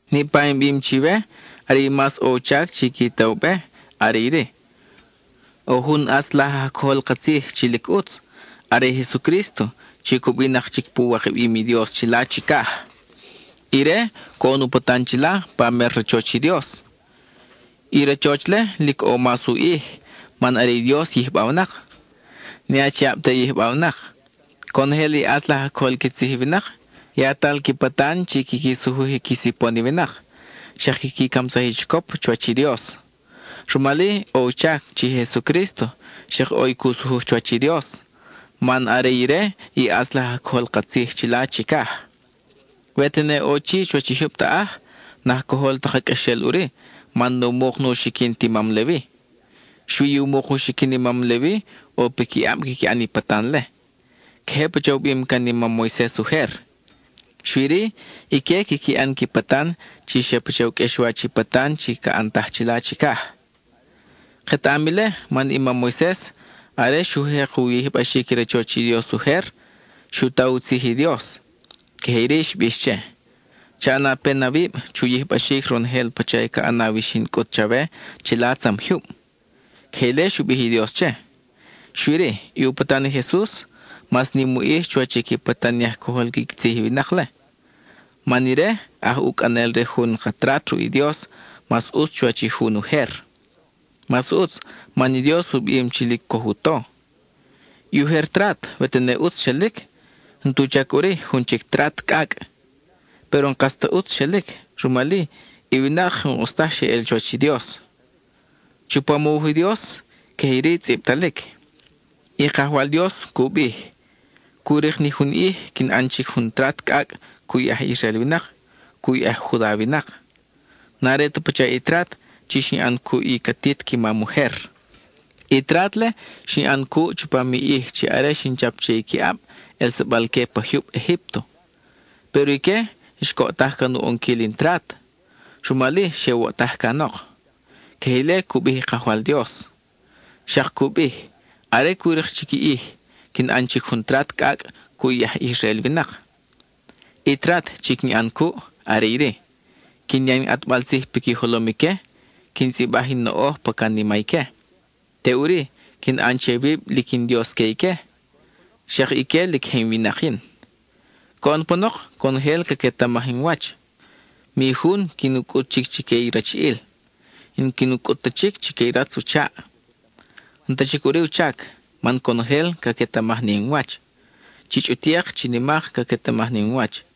Niʼpa in bim chiwe, are i mas ʼo u chac chi qui ta u be are iri: ʼo jun ʼatz laj aj cojol ka tzij lic ʼutz, are i Jesucrísto chi cubinak chic pu wikabim i Dios chila chicaj. Ire coʼon u patan chila pa mer rachoch i Dios; i rachoch-le lic ʼo mas u ʼij man are i Dios yijbawnak, ne achiab ta je yijbawnak. Conojel i ʼatz laj aj cojol qui tzij i winak, yatal qui patan chi quiqui sujuj qui sipon i winak, xak quiqui camsaj i chicop chuwach i Dios. Rumal-i ʼo u chac chi i Jesucrísto xak ʼo i cu sujuj chuwach i Dios, man are ire i ʼatz laj aj cojol ka tzij chila chicaj. We tene ʼo chi chuwach i jyub taʼaj, n-aj cojol ta ka qʼuexel ʼuri man nu muk nu xiquin ti mam Levi. Xui i u muk u xiquin i mam Levi ʼo piquiʼab quiqui ʼan i patan-le. Queje pacha u bim can i mam Moises ujer. Xui-ri, ique quiqui ʼan qui patan chi xa pacha u qʼuexwach i patan chi ca ʼantaj chila chicaj. Ketaʼam ile man i mam Moises, are xu jek u yijbaxic i rachoch i Dios ujer, xu ta u tzij i Dios. Queje iri xbix che: “Cha ʼana pen awib chu yijbaxic ronojel pacha ca ʼanaw i xin cʼut chawe chila tzam jyub.” Queje ile xu bij i Dios che. Xui-ri, i u patan i Jesus, mas nim u ʼij chuwach i qui patan i aj cojol qui tzij i winak-le, man ire aj ucʼanel re jun ka trat ruʼ i Dios mas ʼutz chuwach i jun ujer. Mas ʼutz man i Dios u bim chi lic coj u to. I ujer trat we tene ʼutz xelic, n-tu chac ʼuri jun chic trat cʼacʼ. Péro n-kas ta ʼutz xelic, rumal-i i winak n-ʼus taj xe ʼel chuwach i Dios. Chupam u wuj i Dios, queje iri tzʼibtalic: I Kajwal Dios cu bij: cu rik ni ʼij quin ʼan chic jun trat cʼacʼ cuʼ i aj Israel winak, cuʼ i aj Juda winak. N-are ta pacha i trat chi xin ʼan cuʼ i catit qui mam ujer. I trat-le, xin ʼan cuʼ chupam i ʼij chi are xin chap che i qui ʼab, ʼelsabal-que pa jyub Egípto. Péro ique xcoʼtaj can u ʼonquil in trat; rumal-i xe woʼtaj canok. (Queje ile cu bij i Kajwal Dios.) Xak cu bij: Are cu rik chic i ʼij, quin ʼan chic jun trat cʼacʼ cuʼ i aj Israel winak. I trat chi quin ʼan cuʼ are iri: quin ya in ʼatbal tzij piqui jolom ique; quin tzʼibaj in noʼoj pa canima ique. Teʼuri, quin ʼan che wib lic in Dios que ique; xak ique lic je winak we yin. Coʼon panok, conojel caquetamaj in wach, mi jun quin u cʼut chic chique i rachiʼil, n-quin u cʼut ta chic chique i ratz u chaʼ. N-ta chic ʼuri u chac, man conojel caquetamaj ni in wach, chi chʼutik, chi nimak caquetamaj ni in wach.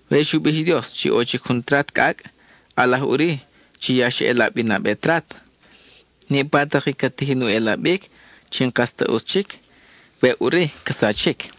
We xu bij i Dios chi ʼo chic jun trat cʼacʼ, ʼalaj ʼuri chi ya xa ʼelab i nabe trat. Niʼpa tak i ca tijin u ʼelabic, chi n-kas ta ʼutz chic, weʼ ʼuri ca sachic.